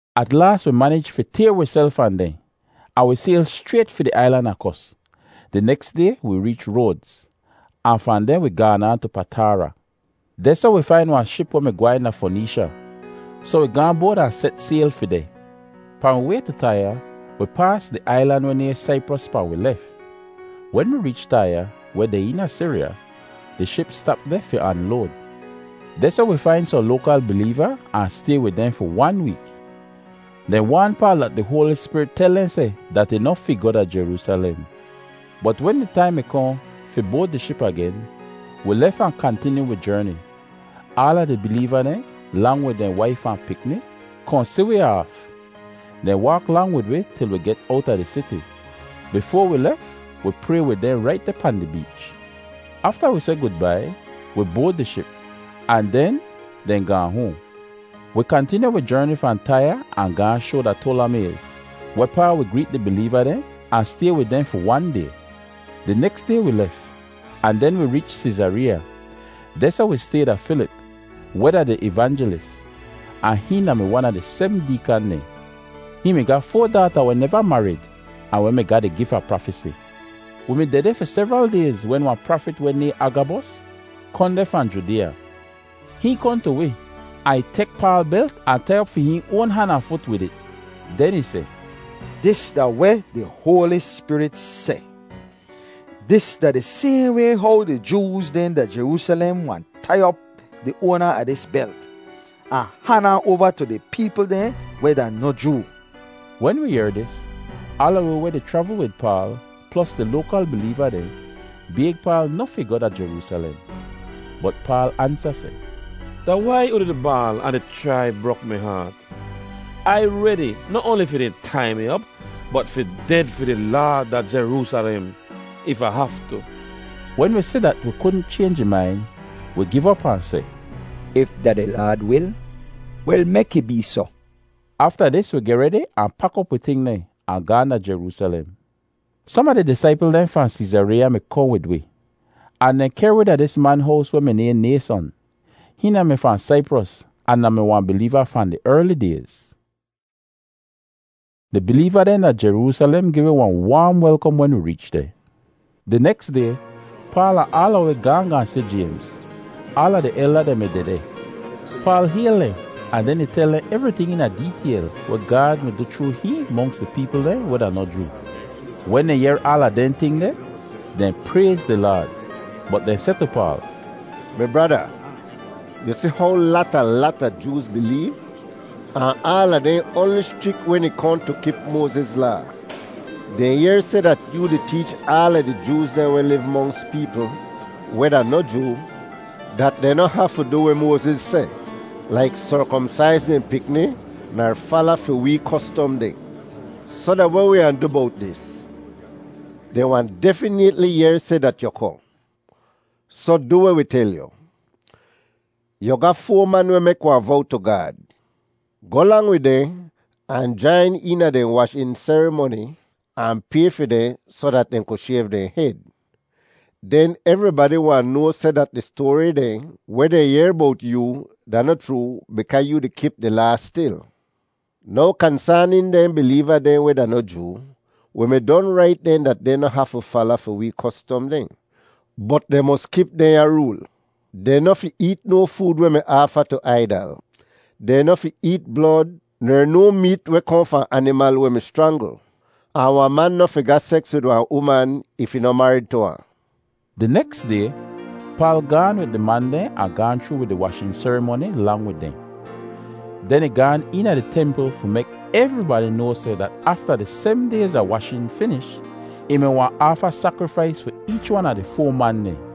At laas wi manij fi tayr wiself fahn dehn, ahn wi sayl schrayt fi di ailan a Kos. Di neks day wi reech Roadz, ahn fahn deh wi gaan aan tu Pataara. Dehsoh wi fain wahn ship weh mi gwehn da Foneesha, soh wi gaahn boad ahn set sayl fi deh. Pahn wi way tu Taiya, wi paas di ailan weh nayhn Saipros pahn wi lef. Wen wi reech Taiya, weh deh eena Siriya, di ship stap deh fi anload. Dehsoh wi fain sohn loakal bileeva ahn stay wid dehn fi wan week. Dehn waan Paal dat di Hoali Spirit tel dehn seh dat ih noh fi goh da Jeroosalem. Bot wen di taim mi kohn fi boad di ship agen, wi lef ahn kantinyu wi jerni. Aala di bileeva dehn, lang wid dehn waif ahn pikni, kohn si wi aaf. Dehn waak lang wid wi til wi get owta di siti. Bifoa wi lef, wi pray wid dehn rait deh pahn di beech. Afta wi seh gudbai, wi boad di ship, ahn den dehn gaahn hoahn. Wi kantinyu wi jerni fahn Taiya ahn gaahn shoa da Toalamays, wehpaa wi greet di bileeva dehn ahn stay wid dehn fi wan day. Di neks day wi lef, ahn den wi reech Seezareeya. Dehsoh wi stay da Filip, weh da di evanjilis, ahn hihn da-mi wan a di sebm deekan dehn. Hihn mi ga foa daata weh neva marid ahn weh mi ga di gif a prafesi. Wi mi dehdeh fi sevral dayz wen wahn prafit weh nayhn Agabos kohn deh fahn Judeeya. Hihn kohn tu wi, ahn ih tek Paal belt ahn tai op fi hihn oan han ahn fut wid it. Den ih seh, “Dis da weh di Hoali Spirit seh: ‘Dis da di sayhn way how di Jooz dehn da Jeroosalem wahn tai op di oana a dis belt, ahn han ahn oava tu di peepl dehn weh da noh Joo.’” Wen wi yehr dis, aala wi weh di chravl wid Paal, plos di loakal bileeva dehn, bayg Paal noh fi goh da Jeroosalem. Bot Paal ansa seh, “Da wai unu di baal ahn di chrai brok mi haat? Ai redi noh oanli fi dehn tai mi op, bot fi ded fi di Laad da Jeroosalem if Ah haftu.” Wen wi si dat wi kudn chaynj ih main, wi giv op ahn seh, “If da di Laad wil, wel mek ih bee soh.” Afta dis wi geh redi ahn pak op wi ting dehn, ahn gaahn da Jeroosalem. Som a di disaipl dehn fahn Seezareeya mi kohn wid wi, ahn dehn kehr wi da dis man hows weh mi nayhn Nayson. Hihn da-mi fahn Saipros ahn da-mi wahn bileeva fahn di erli dayz. Di bileeva dehn da Jeroosalem gi wi wahn waam welkom wen wi reech deh. Di neks day, Paal ahn aala wi gaahn gaahn si Jaymz. Aala di elda dehn mi dehdeh. Paal hayl dehn ahn den ih tel dehn evriting eena deetayl weh Gaad mi du chroo hihn monks di peepl dehn weh da noh Joo. Wen dehn yehr aala dehn ting deh, dehn prayz di Laad, bot dehn seh tu Paal, “Mi brada, yu si how lata lata Jooz bileev, ahn aala dehn oanli schrik wen ih kohn tu kip Moaziz Laa. Dehn yehr seh dat yoo di teech aala di Jooz dehn weh liv monks peepl weh da noh Joo dat dehn noh hafu du weh Moaziz seh, laik serkomsaiz dehn pikni ner fala fi wee kostom dehn. Soh da weh wi wahn du bowt dis? Dehn wahn definaytli yehr seh dat yu kohn. Soh du weh wi tel yu. Yu ga foa man weh mek wahn vow tu Gaad. Goh lang wid dehn ahn jain eena dehn washin serimoni ahn pay fi dehn soh dat dehn ku shayv dehn hed. Den evribadi wahn noa seh dat di stoari dehn weh dehn yehr bowt yoo da noh chroo bikaa yu di kip di Laa stil. Now kansaanin dehn bileeva dehn weh da noh Joo, wi mi don rait dehn dat dehn noh hafu fala fi wee kostom dehn bot dehn mos kip dehnya rool: ‘Dehn noh fi eet no food weh mi aafa tu aidal; dehn noh fi eet blod ner no meet weh kohn fahn animal weh mi schrangl; ahn wahn man noh fi ga seks wid wahn uman if ih noh marid tu ahn.’” Di neks day, Paal gaahn wid di man dehn ahn gaahn chroo di washin serimoni lang wid dehn. Den ih gaan eena di templ fi mek evribadi noa seh dat afta dis sebm dayz a washin finish, ih mi wahn aafa sakrifais fi eech wan a di foa man dehn.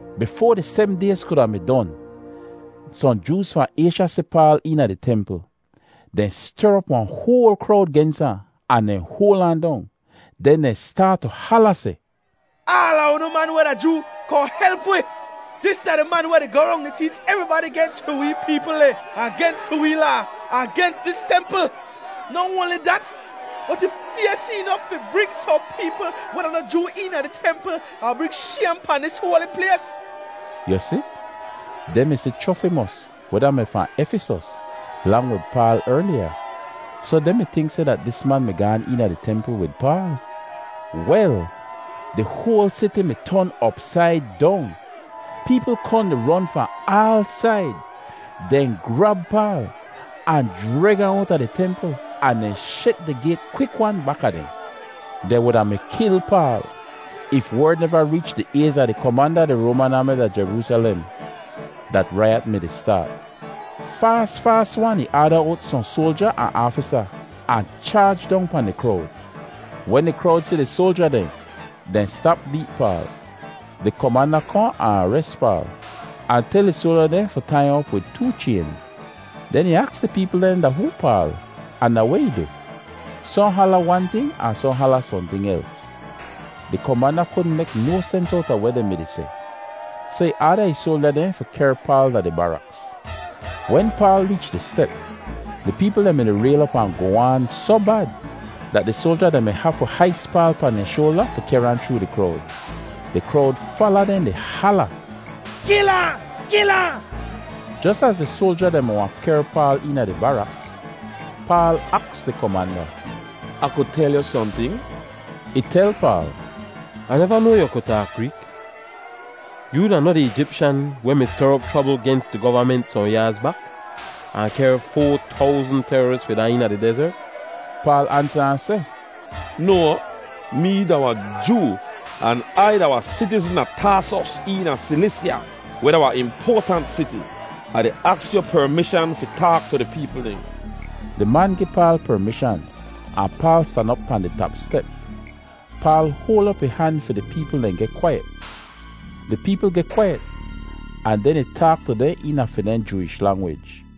Bot bifoa di sebm dayz kuda mi don, sohn Jooz fahn Aysha si Paal eena di templ. Dehn ster op wahn hoal krowd gens ahn, ahn dehn hoal ahn dong. Den dehn staat tu hala seh, “Aala unu man weh da Joo, kohn help wi! Dis da di man weh di goh rong di teech evribadi gens fi wee peepl dehn, ahn gens fi wee Laa, ahn gens dis templ. Noh oanli dat, bot ih faysi inof fi bring sohn peepl weh da noh Joo eena di templ ahn bring shaym pahn dis hoali plays.” (Yu si, dehn mi si Chrofimos, weh da-mi fahn Efisos, lang wid Paal erliya, soh dehn mi tink seh dat dis man mi gaan eena di templ wid Paal.) Wel, di hoal siti mi ton opsaid dong. Peepl kohn di ron fahn aal said. Dehn grab Paal ahn jreg ahn owta di templ ahn dehn shet di gayt kwik-wan baka dehn. Dehn wuda mi kil Paal if werd neva reech di ayz a di komanda a di Roaman aami da Jeroosalem dat raiyat mi-di staat. Faas, faas-wan ih aada owt sohn soalja ahn aafisa ahn chaaj dong pahn di krowd. Wen di krowd si di soalja dehn, dehn stap beet Paal. Di komanda kohn ahn ares Paal ahn tel ih soalja dehn fi tai ahn op wid too chayn. Den ih aks di peepl dehn da hoo Paal, ahn da weh ih du. Sohn hala wan ting ahn sohn hala sohnting els. Di komanda kudn mek no sens owta weh dehn mi-di seh, soh ih aada ih soalja dehn fi kehr Paal da di baraks. Wen Paal reech di step, di peepl dehn mi-di rayl op ahn goh aan soh bad dat di soalja dehn mi hafu hais Paal pahn dehn shoalda fi kehr ahn chroo di krowd. Di krowd fala dehn di hala, “Kil ahn! Kil ahn!” Jos az di soalja dehn mi wahn kehr Paal eena di baraks, Paal aks di komanda, “Ah ku tel yu sohnting?” Ih tel Paal, “Ah neva noa yu ku taak Greek. Yoo da noh di Eejipshan weh mi ster op chrobl gens di govament sohn yaaz bak, ahn kehr foa towzn teroris wid ahn eena di dezert?” Paal ansa ahn seh, “No! Mee da wahn Joo, an Ai da wahn sitizn a Taasos eena Silisya weh da wahn impoatant siti. Ah di aks yu permishan fi taak tu di peepl dehn.” Di man gi Paal permishan ahn Paal stan op pahn di tap step. Paal hoal op ih han fi di peepl dehn geh kwaiyet. Di peepl geh kwaiyet ahn den ih taak tu dehn eena fi dehn Jooish langwij.